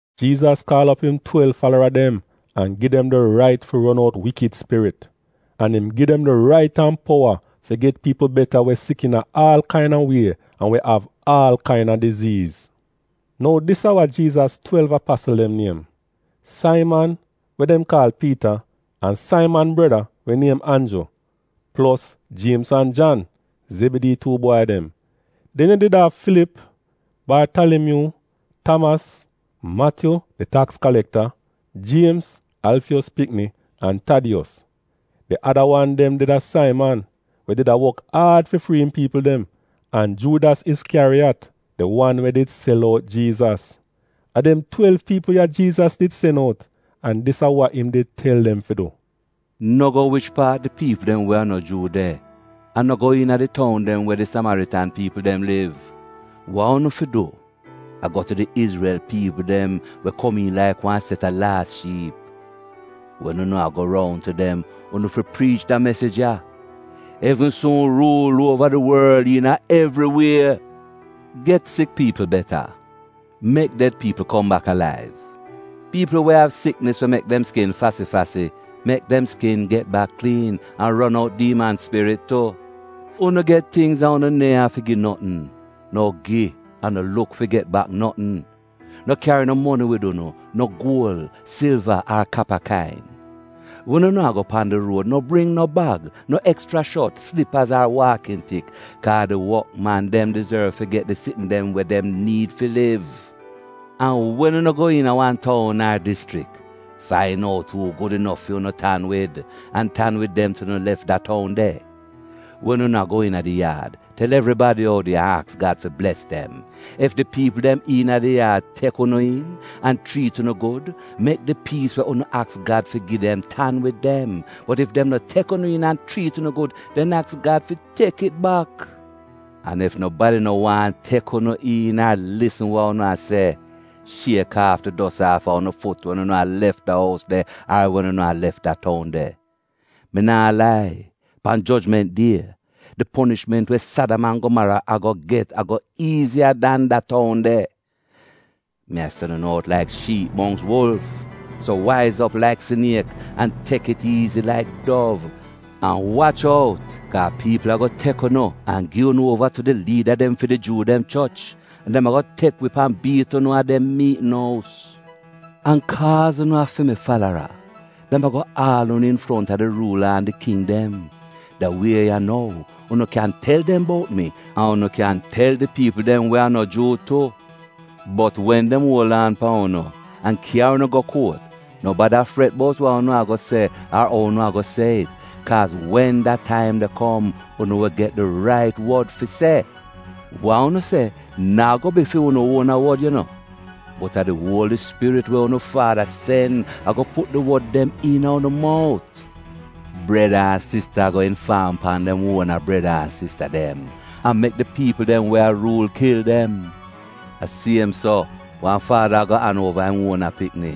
Jiizas kaal op im twelv falara dem an gi dem di rait fi ron out wikid spirit. An im gi dem di rait an powa fi get piipl beta we sik iina aal kaina wie an we av aal kaina siknis. Nou dis a wa Jiizas twelv apasl dem niem: Saiman, we dem kaal Piita an Saiman breda we niem Anju, plos Jiemz an Jan — Zebidii tuu bwai dem. Den yu did av Filip, Bartalimyuu, Tamas, Matyu — di taks kalekta, Jiemz — Alfiyos pikni, an Tadiyos. Di ada wan dem did a Saiman, we did a wok aad fi frii im piipl dem, an Juudas Iskyariyat, di wan we did sel out Jiizas. A dem twelv piipl ya Jiizas did sen out, an dis a wa im did tel dem fi du: “No go wich paat di piipl dem we a no Juu de, an no go iina di toun dem we di Samaritan piipl dem liv. Wa unu fi du, a go tu di Izrel piipl dem we komiin laik wan set a laas shiip. Wen unu a go roun tu dem, unu fi priich da mesij ya: ‘Evn suun ruul uova di worl iina evri wie.’ Get sik piipl beta, mek ded piipl kom bak alaiv, piipl we av siknis we mek dem skin fasi-fasi — mek dem skin get bak kliin, an ron out diiman spirit tu. Unu get tingz an unu neehn afi gi notn, nou gi an no luk fi get bak notn. No kyari no moni wid unu: no guol, silva ar kapa kain. Wen unu a go pan di ruod no bring no bag, no ekschra shot, slipaz ar waakn tik, kaa di wokman dem dizorv fi get di sitn dem we dem niid fi liv. “An wen unu go iina wan toun ar dischrik, fain out uu gud inof fu'unu tan wid, an tan wid dem til unu lef da toun de. Wen unu a go iina di yaad, tel evribadi oudi an aks Gad fi bles dem. Ef di piipl dem iina di yaad tek unu iin, an chriit unu gud, mek di piis we unu aks Gad fi gi dem, tan wid dem, bot ef dem no tek unu iin an chriit unu gud, den aks Gad fi tek it bak. An ef nobadi no waahn tek unu iin ar lisn wa unu a se, shiek aaf di dos aafa unu fut wen unu a lef da ous de ar wen unu a lef da toun de. Mi naa lai, pan jojment die, di ponishment we Sadam an Gomaro ago get ago iiziya dan da toun de. Mi a sen unu out laik shiip mongks wulf. So waiz op laik siniek an tek it iizi laik dov. “An wach out, kaa piipl ago tek unu, an gi unu uova tu di liida dem fi di Juu dem choch, an dem ago tek wip an biit unu a dem miitn ous. An kaaz unu a fi mi falara, dem ago aal unu infronta di ruula an di king dem, da wie ya nou, unu kyan tel dem bout mi, an unu kyan tel di piipl dem we a no Juu tu. Bot wen dem uol aan pan unu an kyari unu go kuot, no bada fret bout wa unu ago se ar ou unu ago se it. Kaaz wen da taim de kom unu wi get di rait wod fi se. Wa unu se naa go bi fu'unu uona wod yu no, bot a di Uoli Spirit we unu Faada sen ago put di wod dem iina unu mout. “Breda an sista ago infaam pan dem uona breda an sista dem, an mek di piipl dem we a ruul kil dem. A siem so, wan faada ago an uova im uona pikni.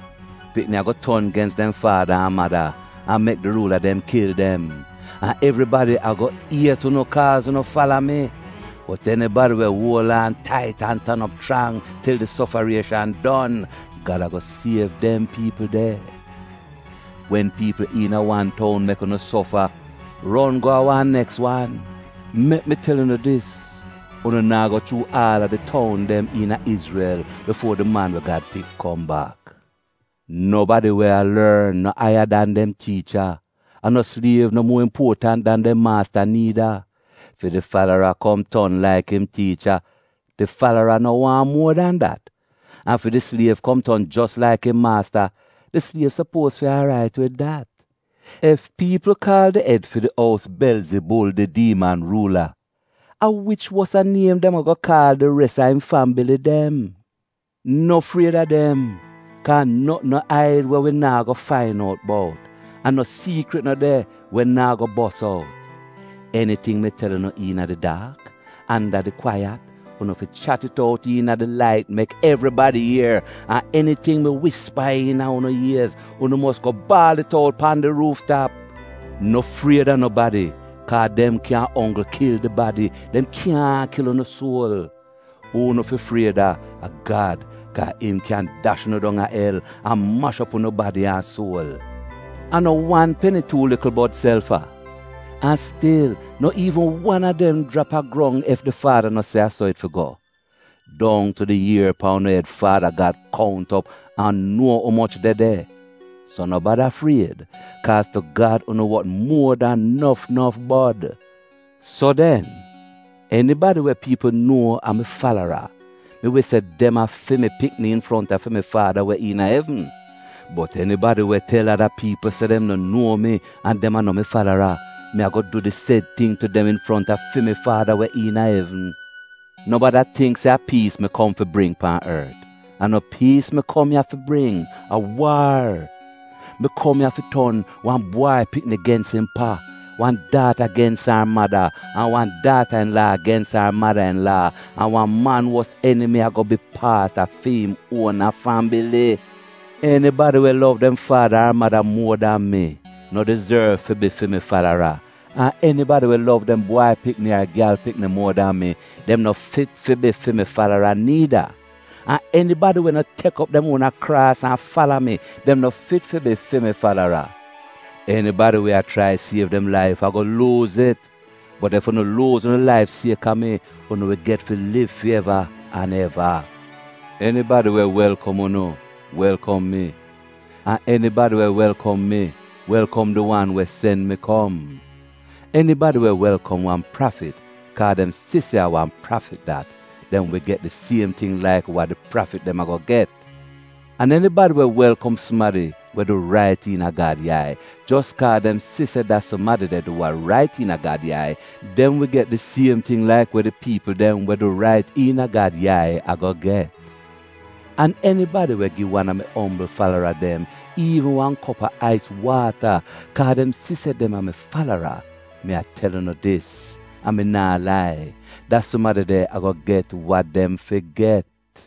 Pikni ago ton gens dem faada an mada an mek di ruula dem kil dem. An evribadi ago iet unu kaaz unu fala mi. Bot enibadi we uol aan tait an tan op chrang til di sofarieshan don, Gad ago siev dem piipl de. Wen piipl iina wan toun mek unu sofa, ron go a wan neks wan. Mek mi tel unu dis, unu naa go chuu aal a di toun dem iina Izrel bifuo di Man we Gad Pik kom bak. “Nobadi we a lorn no aiya dan dem tiicha, an no sliev no muo impuotant dan dem maasta niida. Fi di falara kom ton laik im tiicha — di falara no waahn muo dan dat, an fi di sliev kom ton jos laik im maasta, di sliev sopuoz fi aarait wid dat. Ef piipl kaal di ed fi di ous ‘Belzibul, di diiman ruula,’ a wich wosa niem dem ago kaal di res a im fambili dem? “No fried a dem kaa notn no aid we wi naa go fain out bout, an no siikrit no de we naa go bos out. Eniting mi tel unu iina di daak, anda di kwaiyat, unu fi chat it ou iina di lait mek evribadi ier. An eniting mi wispa iina unu iez, unu mos go baal it out pan di ruuf tap. No fried a nobadi, kaa dem kyan onggl kil di badi, dem kyaahn kil unu suol. Uu unu fi fried a a Gad, kaa im kyan dash unu dong a el, an mash op unu badi an suol. A no wan peni tuu likl bod sel fa? An stil no iivn wan a dem jrap a grong ef di Faada no se a so it fi go. Dong tu di ier pan unu ed Faada Gad kount op an nuo umoch de de. So no bada fried, kaaz tu Gad unu wot muo dan nof nof bod. “So den, enibadi we piipl nuo a mi falara, mi wi se dem a fi mi pikni infronta fi mi Faada we iina evn. Bot enibadi we tel ada piipl se dem no nuo mi an dem a no mi falara, mi ago du di sed ting tu dem infronta fi mi Faada we iina evn. “No bada tingk se a piis mi kom fi bring pan ort. A no piis mi kom ya fi bring, a waar! Mi kom ya fi ton “‘Wan bwai pikni gens im pa, wan daata gens ar mada, an wan daata-in-laa gens ar mada-in-laa. An wan man wos enimi, ago bi paat a fi'im uona fambili.’ “Enibadi we lov dem faada ar mada muo dan mi, no dizorv fi bi fi mi falara, an enibadi we lov dem bwai pikni ar gyal pikni muo dan mi, dem no fit fi bi fi mi falara niida. An enibadi we no tek op dem uona kraas an fala mi, dem no fit fi bi fi mi falara. Enibadi we a chrai siev dem laif, ago luuz it. Bot ef unu luuz unu laif sieka mi, unu wi get fi liv fi eva an eva. “Enibadi we welkom unu, welkom mi. An enibadi we welkom mi, welkom di wan we sen mi kom. Enibadi we welkom wan prafit, kaa dem si se a wan prafit dat, dem wi get di siem ting laik wa di prafit dem ago get. An enibadi we welkom sumadi we du rait iina Gad yai, jos kaa dem si se da sumadi de du wa rait iina Gad yai, dem wi get di siem ting laik we di piipl dem we du rait iina Gad yai ago get. An enibadi we gi wan a mi ombl falara dem iivn wan kop a ais waata, kaa dem si se dem a fi mi falara, mi a tel unu dis, an mi naa lai, da sumadi de ago get wa dem fi get.”